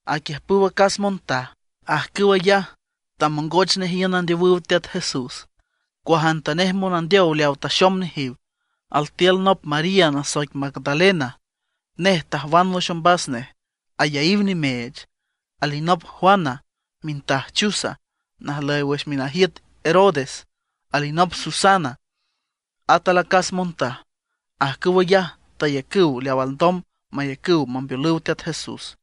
Aquiüjpüw acas montaj, ajcüw ayaj tamongoch nej iün andeowüw Teat Jesús, cuajantanej monandeow leaw taxom nejiw. Altiül nop María nasoic Magdalena, nej tajwan wüx ombas nej ayaíw nimeech. Alinop Juana mintaj Chuza najlüy wüx minajiüt Herodes; alinop Susana, at alacas montaj. Ajcüw ayaj tayacüw leaw alndom mayacüw mambeolüw Teat Jesús.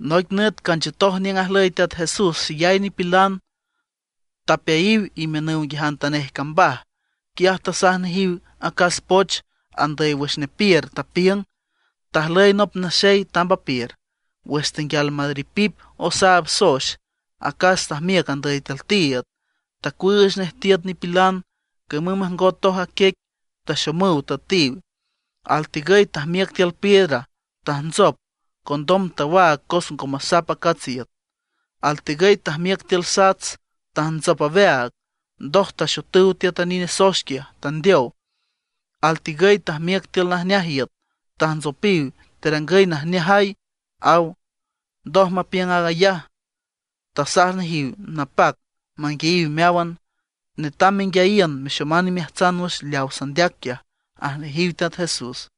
Noic nüt canchiütoj niüng ajlüy Teat Jesús xeyay nipilan, tapeayiw imiünüw nguiajantanej cambaj. Quiaj tasaj nejiw acas poch andüy wüx nepiür, tapiüng: ―Tajlüy nop naxey tamb apiür. Wüx tenguial maripip osaab soex, acas tajmiüc andüy tiül tiiüd, tacuüüch nej tiüt nipilan, camüm majngotoj a quiec, taxomüw tüetiw. Altigüy tajmiüc tiül piedra, tajntsop, condom tawaag cos ngo masap acats a iüt. Altigüy tajmiüc tiül sats, tajntsop aweaag. Ndoj taxotüw tiüt a nine soex quiaj, tandeow. Altigüy tajmiüc tiül najneaj iüt, tajntsopiw, terangüy najneajay ―aw. Ndoj mapiüng ayaj, tasaj nejiw napac manguiayiw meáwan: ―Netam menguiayiün mexoman imeajtsan wüx leaw sandeac quiaj ―aj nejiw Teat Jesús.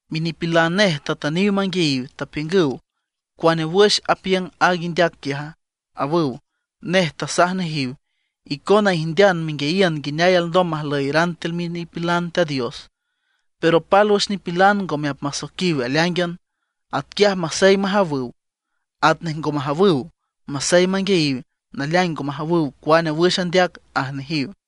Minipilan nej tatüniw manguiayiw, tapiüngüw: ―¿Cuane wüx apiüng aaga indeac quiaja? ―awüw. Nej tasaj nejiw: ―Icona ijndean menguiayiün nguineay alndom majlüyeran tiül minipilan Teat Dios, pero pálwüx nipilan ngome apmasoiquiw aleáingan; atquiaj masey majawüw, atnej ngo majawüw. Masey manguiayiw, naleaing ngo majawüw cuane wüx andeac ―aj nejiw.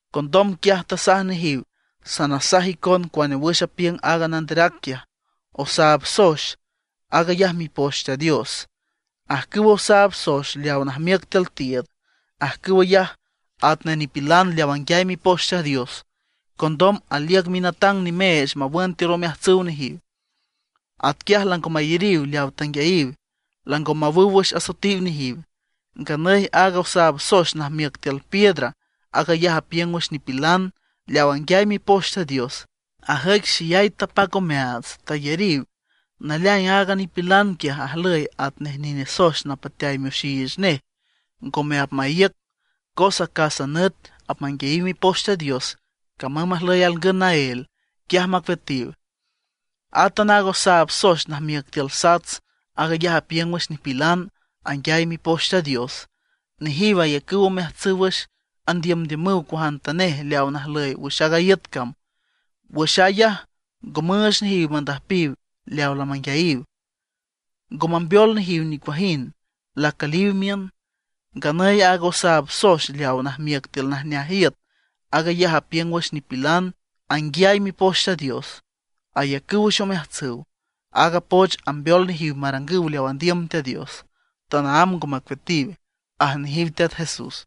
Condom quiaj tasaj nejiw: ―Sanasaj icon cuane wüx apiüng aaga nanderac quiaj: Osaab soex, aag ayaj Mipoch Teat Dios. Ajcüwa osaab soex leawa najmiüc tiül tiiüd, ajcüw ayaj atnej nipilan leaw anguiay Mipoch Teat Dios; condom aliüc minatang nimeech mawün tiül omeajtsüw nejiw. Atquiaj lango mayariw leawa tanguiayiw, lango mawüw wüx asoetiw nejiw. Nganüy aaga osaab soex najmiüc tiül piedra, aag ayaj apiüng wüx nipilan leaw anguiay Mipoch Teat Dios, ajüic xeyay tapac omeaats tayariw. Naleaing aaga nipilan quiaj ajlüy atnej nine soex napateay mioxiich nej, ngome apmaíüc; cos acásan nüt apmanguiayiw Mipoch Teat Dios, camüm majlüy alngün naél, quiaj macueatiw. Átan aaga osaab soex najmiüc tiül sats, aag ayaj apiüng wüx nipilan anguiay Mipoch Teat Dios; nejiw ayacüw omeajtsüw wüx andiümdiümüw cuajantanej leaw najlüy wüx aaga iüt cam. Wüx aag ayaj ngo müüch nejiw mandüjpiw leaw lamanguiayiw. Ngo mambeol nejiw nicuajind, lacüliw miün. Nganüy aaga osaab soex leaw najmiüc tiül najneaj iüt, aag ayaj apiüng wüx nipilan anguiay Mipoch Teat Dios, ayacüw wüx omeajtsüw. Aaga poch ambeol nejiw marangüw leaw andiüm Teat Dios, tanaámb ngo macueatiw ―aj nejiw Teat Jesús.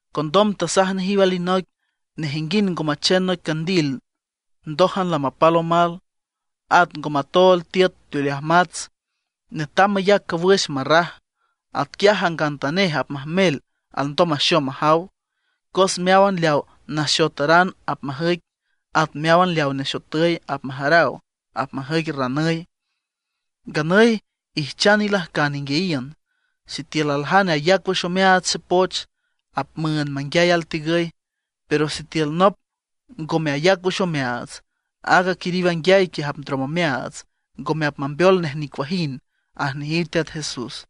Condom tasaj nejiw alinoic: ―Nejinguind ngo machen noic candil ndójan lamapal omal, at ngo matool tiüt teoleaj mats; netam mayac cawüx marraj, atquiaj jangantanej apmajmel alndom maxom majaw. Cos meáwan leaw naxotaran apmajüic, at meáwan leaw nexotüy apmajaraw, apmajüic ranüy. ’Nganüy ijchan ilajcan inguiayiün, sitiül aljane ayac wüx omeaats xepoch, apmüünd manguiay altigüy. Pero sitiül nop ngome ayac wüx omeaats, aaga quiriw anguiay quiaj apndrom omeaats, ngome apmambeol nej nicuajind ―aj nejiw Teat Jesús.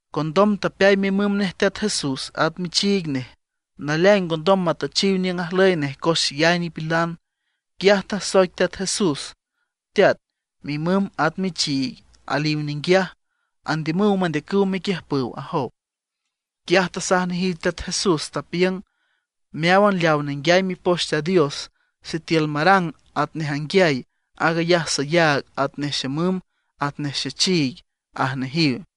Condom tapeay mimüm nej Teat Jesús, at michiig nej; naleaing ngondom matüchiw niüng ajlüy nej cos xeyay nipilan. Quiaj tasoic Teat Jesús: ―Teat, mimüm at michiig aliw ninguiaj, andiümüw mendeacüw mequiüjpüw ―ajow. Quiaj tasaj nejiw Teat Jesús, tapiüng: ―Meáwan leaw nenguiay Mipoch Teat Dios, sitiül marang atnej anguiay, aag ayaj sayaag atnej xemüm, atnej xechiig ―aj nejiw.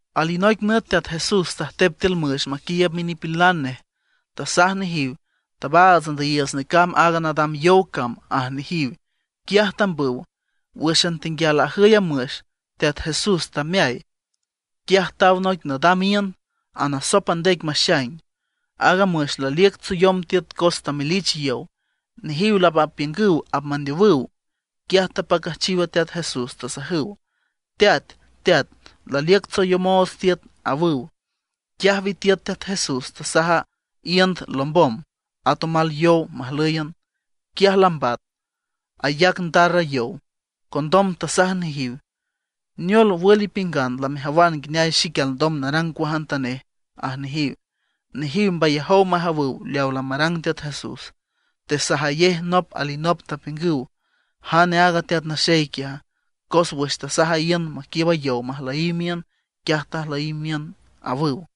Alinoic nüt Teat Jesús tajtep tiül müx maquiiüb minipilan nej, tasaj nejiw: ―Tabaats andüyiiüts necamb aaga nadam yow cam ―aj nejiw. Quiaj tambüw. Wǘxan tenguial ajüy a müx Teat Jesús tameay. Quiaj taw noic nadam iünd anasop a ndec maxaing. Aaga müx laliüc tsoyom tiüt cos tamelich yow. Nejiw lamapiüngüw apmandeowüw. Quiaj tapacüjchiw a Teat Jesús, tasajüw: ―¡Teat! ¡Teat! ¡Laliüc tsoyomoots tiüt! ―awüw. Quiaj witiüt Teat Jesús, tasaj a iünd lombom, at omal yow majlǘyan. Quiaj lambat, ayac ndar a yow. Condom tasaj nejiw: ―¿Neol, wül ipiüngan lamejawan nguineay xique alndom narang cuajantaneje? ―aj nejiw. Nejiw mbayajow majawüw leawa lamarang Teat Jesús. Tesajayej nop alinop, tapiüngüw: ―¿Jane aaga teat naxey quiaja? cos wüx tasaj a iünd maquiiüb a yow majlüyiw miün, quiaj tajlüyiw miün ―awüw.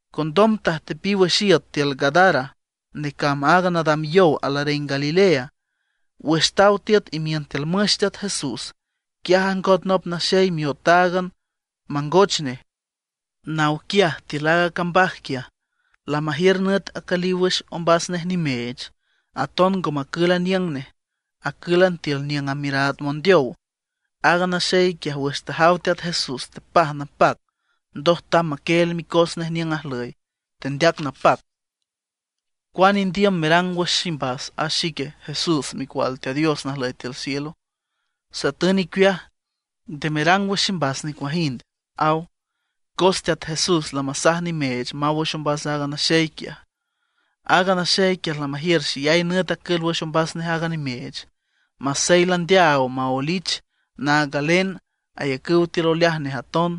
Condom tajtepiw wüx iüt tiül Gadara, necamb aaga nadam yow alareng Galilea. Wüx taw tiüt imiün tiül müx Teat Jesús, quiaj ajngot nop naxey miotáagan mangoch nej, naw quiaj tiül aaga cambaj quiaj. Lamajiür nüt acüliw wüx ombas nej nimeech. Aton ngo macül aniüng nej, acǘlan tiül niüng amiüraad mondeow. Aaga naxey quiaj wüx tajaw Teat Jesús tepaj napac, ndoj tamb maquieel micos nej niüng ajlüy, tendeac napac: ―¿Cuane indiüm merang wüx ximbas a ique, Jesús Micual Teat Dios najlüy tiül cielo? Satün icueaj, nde merang wüx ximbas nicuajind ―aw. Cos Teat Jesús lamasaj nimeech maw wüx ombas aaga naxey quiaj. Aaga naxey quiaj lamajiür xeyay nüt acül wüx ombas nej aaga nimeech. Masey landeaaw maoelich naag galen, ayacüw tiül oleaj nej aton.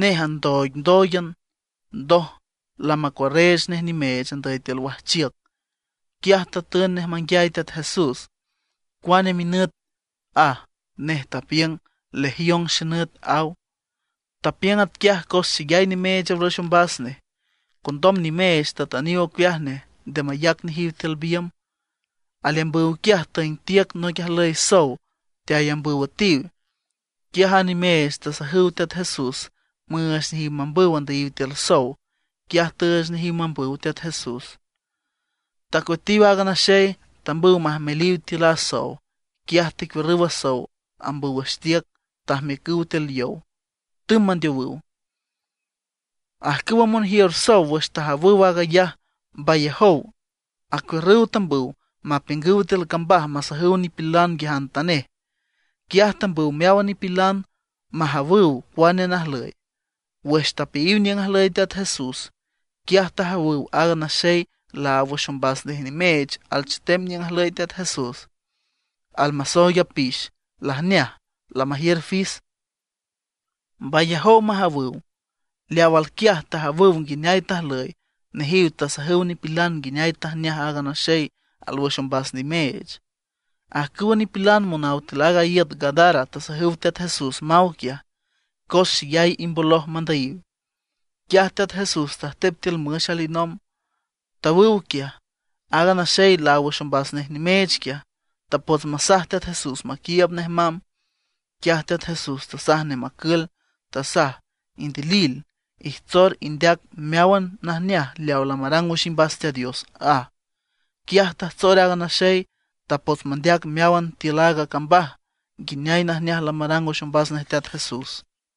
Nej andooigndóoigan, ndoj lamacuarreech nej nimeech andüy tiül wajchiüc. Quiaj tatün nej manguiay Teat Jesús: ―¿Cuane minüt? ―aj. Nej tapiüng: ―Legión xenüt ―aw. Tapiüng atquiaj cos xeyay nimeech alwüx ombas nej. Condom nimeech tatüniw ocueaj nej nde mayac nejiw tiül biümb. Aleambüw quiaj tüeng tiüc noic ajlüy sow teayambüw üetiw. Quiaj a nimeech tasajüw Teat Jesús müüch nejiw mambüw andüyiw tiül sow. Quiaj tüüch nejiw mambüw Teat Jesús. Tacueatiw aaga naxey, tambüw majmeliw tiül a sow. Quiaj tecuiürrüw a sow ambüw wüx tiüc, tajmiücüw tiül yow, tümb mandeowüw. Ajcüwa monjiür sow wüx tajawüw aag ayaj mbayajow acuiürrüw tambüw mapiüngüw tiül cambaj masajüw nipilan nguiajantanej. Quiaj tambüw meáwan nipilan majawüw cuane najlüy. Wüx tapeayiw niüng ajlüy Teat Jesús, quiaj tajawüw aaga naxey laáw wüx ombas nej nimeech alchetem niüng ajlüy Teat Jesús. Almasooig apix, lajneaj, lamajiür fis. Mbayajow majawüw. Leaw alquiaj tajawüw nguineay tajlüy. Nejiw tasajüw nipilan nguineay tajneaj aaga naxey alwüx ombas nimeech. Ajcüwa nipilan monaw tiül aaga iüt Gadara tasajüw Teat Jesús maw quiaj, cos xeyay imboloj mandüyiw. Quiaj Teat Jesús tajtep tiül müx alinomb, tawüw quiaj. Aaga naxey laáw wüx ombas nej nimeech quiaj, tapots masaj Teat Jesús maquiiüb nej mamb. Quiaj Teat Jesús tasaj nej macül, tasaj: ―Indilil, ijtsor indeac meáwan najneaj leaw lamarang wüx imbas Teat Dios ―aj. Quiaj tajtsor aaga naxey. Tapots mandeac meáwan tiül a cambaj nguineay najneaj lamarang wüx ombas nej Teat Jesús.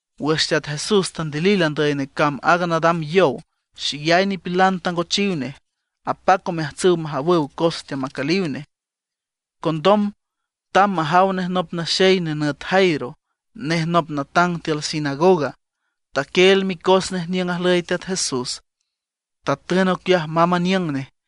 Wüx Teat Jesús tandilil andüy necamb aaga nadam yow, xeyay nipilan tangochiw nej. Apac omeajtsüw majawüw cos teamacüliw nej. Condom tamb majaw nej nop naxey nenüt Jairo; nej nop natang tiül sinagoga. Taquieel micos nej niüng ajlüy Teat Jesús, tatün ocueaj mamb aniüng nej.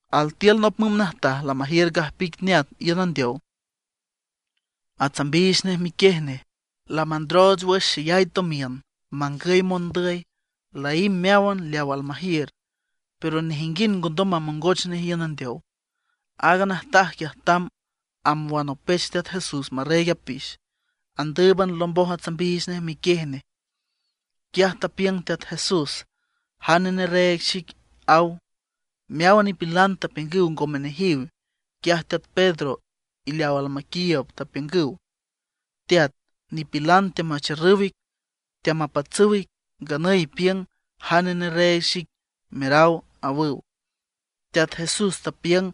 Altiül nop müm najtaj lamajiür gajpic neat iün andeow, atsambiich nej miquiej nej. Lamandrooch wüx xeyay tomiün mangüy mondüy. Laímb meáwan leaw almajiür, pero nejinguind ngondom mamongoch nej iün andeow. Aaga najtaj quiaj tamb amb wanopech Teat Jesús marreeg apix. Andǘüban lomboj atsambiich nej miquiej nej. Quiaj tapiüng Teat Jesús: ―¿Jane nerreeg xic? ―aw. Meáwan nipilan tapiüngüw ngome nejiw. Quiaj teat Pedro y leaw almaquiiüb tapiüngüw: ―Teat, nipilan teamacharrüw ic, teamapatsüw ic, nganüy ipiüng: “¿Jane nerreeg xic?” meraw ―awüw. Teat Jesús tapiüng: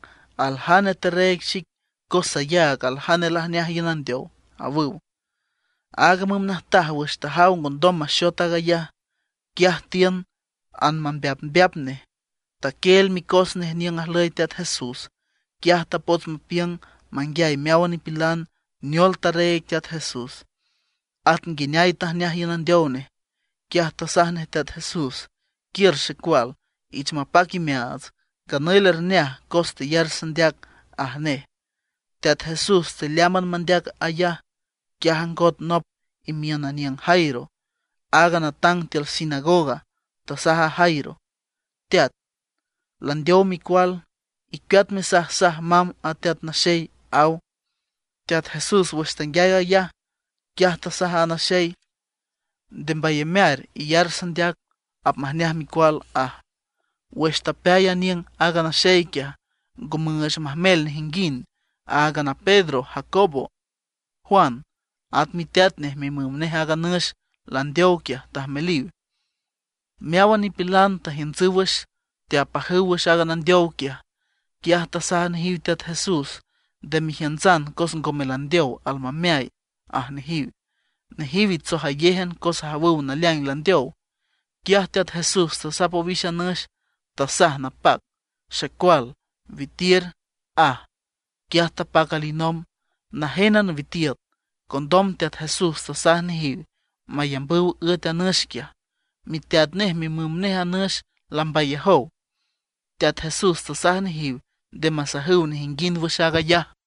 ―Aljane tarreeg xic, cos sayaag aljane lajneaj iün andeow ―aw. Aaga müm najtaj wüx tajaw ngondom maxot aag ayaj, quiaj tiün anmambeapmbeap nej, taquieel micos nej niüng ajlüy Teat Jesús. Quiaj tapots mapiüng manguiay meáwan nipilan neol tarreeg Teat Jesús, at nguineay tajneaj iün andeow nej. Quiaj tasaj nej Teat Jesús: ―Quiür xecual, ich mapac imeaats, nganüy lerneaj cos teyar sandeac ―aj nej. Teat Jesús tealeámban mandeac aag ayaj, quiaj ajngot nop imiün aniüng Jairo, aaga natang tiül sinagoga, tasaj a Jairo: ―Teat, landeow micual, icueat mesajsaj mamb a Teat Naxey ―aw. Teat Jesús wüx tanguiay aag ayaj, quiaj tasaj aaga naxey: ―Nde mbayamear, iyar sandeac, apmajneaj micual ―aj. Wüx tapeay aniüng aaga naxey quiaj, ngo müüch majmel nejinguind, áagan a Pedro, Jacobo, Juan; at miteat nej, mimüm nej aaga nüx landeow quiaj tajmeliw. Meáwan nipilan teajiüntsüw wüx, teapajüw wüx aaga nandeow quiaj. Quiaj tasaj nejiw Teat Jesús: ―Nde mejiüntsan cos ngome landeow, almameay ―aj nejiw. Nejiw itsojayéjan cos ajawüw naleaing landeow. Quiaj Teat Jesús tasap owix a nüx, tasaj napac: ―Xecual, witiür ―aj. Quiaj tapac alinomb. Najénan witiüt. Condom Teat Jesús tasaj nejiw mayambüw üet a nüx quiaj. Miteat nej mimüm nej a nüx lambayajow. Teat Jesús tasaj nejiw nde masajüw nejinguind wüx aag ayaj.